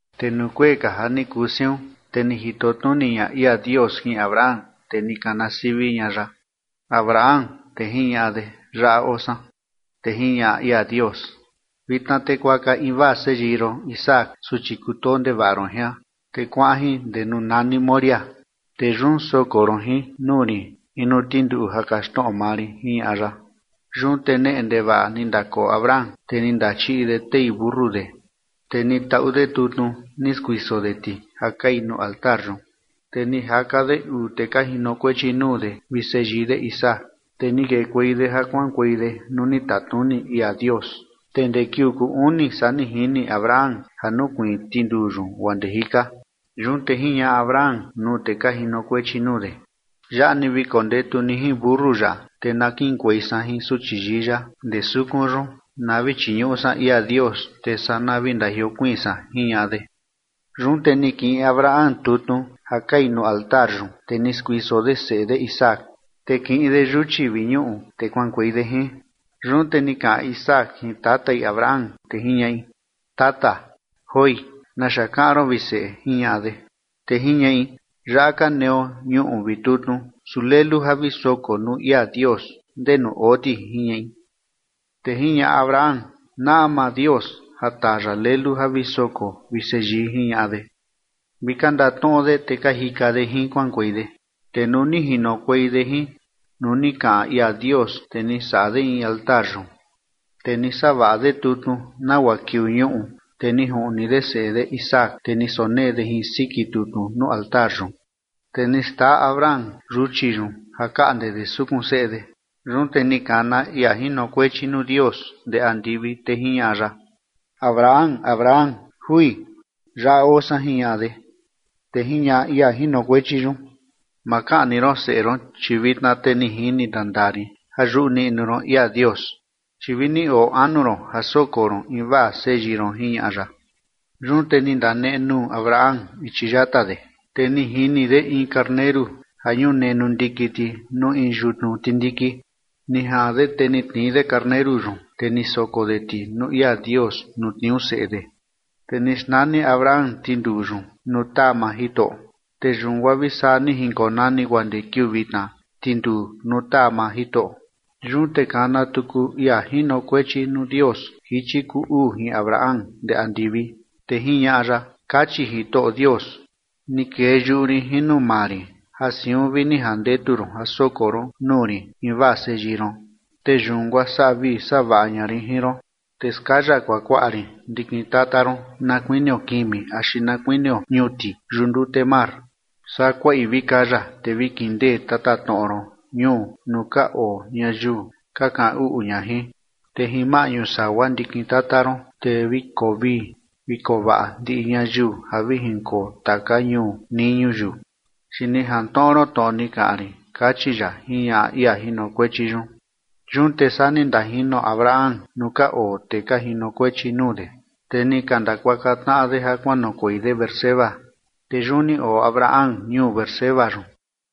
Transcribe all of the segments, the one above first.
Te nuu kuee ka ja ni kuu siun, te ni jito tnuni ña ia Dios jin Abraham, te ni kana sivi ña ya: ―Abraham. Te jiñaꞌa de: ―Yaꞌa oo san. Te jiñaꞌa ia Dios: ―Vitna te kuaka invaa seyii ron Isaac, suchi kutoo ndevaꞌa ron jian, te kuaꞌan jin ndee nuu nani Moriah, te yun soko ron jin nuu rin in nuu tinduu ja kaxtnoꞌo maa rin ―jiñaꞌa ya. Yun te neꞌe ndevaꞌa ni ndakoo Abraham, te ni ndachiꞌi de tei mentu de, te ni taꞌu de tutnu ni skuiso de ti ja kai nuu altar yun, te ni jaka de uu tee ka jinokuechi nuu de vi seyii de Isaac, te ni kekuei de ja kuaꞌankuei de nuu ni tatnuni ia Dios. Te ndee kiuu kuu uni saa ni jini Abraham ja nukuiin tinduu yun guaa ndee jika. Yun te jiñaꞌa Abraham nuu tee ka jinokuechi nuu de: ―Yaꞌa ni vi kondetu ni jin mentu yaꞌa, te na kiꞌinkuei san jin suchi yii yaꞌa ndee sukun yun na vi chiñuꞌu san ia Dios, te saa na vi ndajiokuiin san ―jiñaꞌa de. Yun te ni kiꞌin Abraham tutnu ja kai nuu altar yun, te ni skuiso de seꞌe de Isaac, te kiꞌin de yuchi vi ñuꞌu, te kuaꞌankuei de jin. Yun te ni kaꞌan Isaac jin tatai Abraham, te jiñaꞌi: ―Tata. ―Joi. ¿Naxa kaꞌan ron, vi seꞌe? ―jiñaꞌa de. Te jiñaꞌi: ―Yaꞌa ka neo ñuꞌu vi tutnu, su lelu ja vi soko nuu ia Dios, ¿ndenu oo ti? ―jiñaꞌi. Te jiñaꞌa Abraham: ―Naꞌa maa Dios ja taa ya lelu ja vi soko, vi seyii ―jiñaꞌa de. Vi ka ndatnoꞌo de, te ka jika de jin kuaꞌankuei de. Te nuu ni jinokuei de jin nuu ni kaꞌan ia Dios, te ni saꞌa de in altar yun, te ni savaꞌa de tutnu nagua kiuu ñuꞌu, te ni juꞌni de seꞌe de Isaac, te ni sonee de jin siki tutnu nuu altar yun. Te ni xtaa Abraham yuchi yun ja kaꞌnde de sukun seꞌe de. Yun te ni kana ia jinokuechi nuu Dios ndee andivi, te jiñaꞌa ya: ―¡Abraham! ¡Abraham! ―Jui. Yaꞌa oo san ―jiñaꞌa de. Te jiñaꞌa ia jinokuechi yun: ―Ma kaꞌni ron seꞌe ron, chi vitna te ni jini ndandaa rin ja yuꞌu niꞌnu ron ia Dios, chi vini oo anu ron ja soko ron invaa seyii ron ―jiñaꞌa ya. Yun te ni ndanenuu Abraham ichi yata de, te ni jini de in karneru ja ñunenu ndiki ti nuu in yutnu tindiki. Ni jaꞌan de te ni tnii de karneru yun, te ni soko de ti nuu ia Dios nuu tniuu seꞌe de. Te ni xnani Abraham tinduu yun nuu taa maa Jitoꞌo. Te yun guaa vi saa ni jinkonani guaa ndee kiuu vitna: Tinduu nuu taa maa Jitoꞌo. Yun te kana tuku ia jinokuechi nuu Dios jichi kuu uu jin Abraham ndee andivi, te jiñaꞌa ya: ―Kachi Jitoꞌo Dios: “Ni kee yuꞌu rin jin nuu maa rin ja siun vi ni jandetu ron ja soko ron nuu rin invaa seyii ron. Te yun guaa saꞌa vii saꞌa vaꞌa ña rin jin ron, te skaya kuakuaꞌa rin ndikin tata ron na kuinio kimi axi na kuinio ñuti yuꞌu ndute mar, saa kuaꞌi vi kaya te vi kindee tatatnoꞌo ron ñuu nuu ka oo ñayiu ka kaꞌan uꞌu ña jin. Te jin maꞌñu sagua ndikin tata ron, te vi koo vii vi koo vaꞌa ndiꞌi ñayiu ja vi jinkoo taka ñuu nii ñuyiu, chi ni jantnoꞌo ron tnoꞌo ni kaꞌan rin”, kachi ya ―jiñaꞌa ia jinokuechi yun. Yun te saa ni ndajino Abraham nuu ka oo tee ka jinokuechi nuu de, te ni ka ndakuaka tnaꞌa de ja kuanoꞌokuei de Beerseba, te yun ni oo Abraham ñuu Beerseba yun.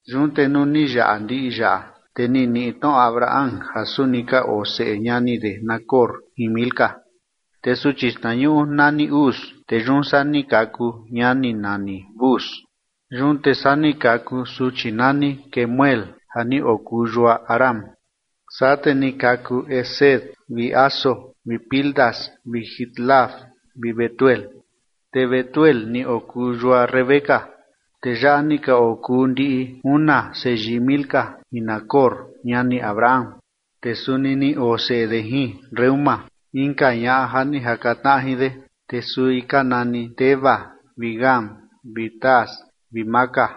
Yun te nuu ni yaꞌa ndiꞌi yaꞌa, te ni niꞌi tnoꞌo Abraham ja suni ka oo seꞌe ñani de Nacor jin Milca. Te suchi xtnañuꞌu nani Uz, te yun saa ni kaku ñani nani Buz, yun te saa ni kaku suchi nani Kemuel ja ni okuu yua Aram. Saa te ni kaku Quesed vi Hazo vi Pildas vi Jidlaf vi Betuel. Te Betuel ni okuu yua Rebeca. Tee yaꞌa ni ka okuu ndi una seyii Milca jin Nacor, ñani Abraham. Te suni ni oo seꞌe de jin Reúma, inka ñaꞌa ja ni jaka tnaꞌa jin de, te sui ka nani Teba vi Gaham vi Tahas vi Maaca.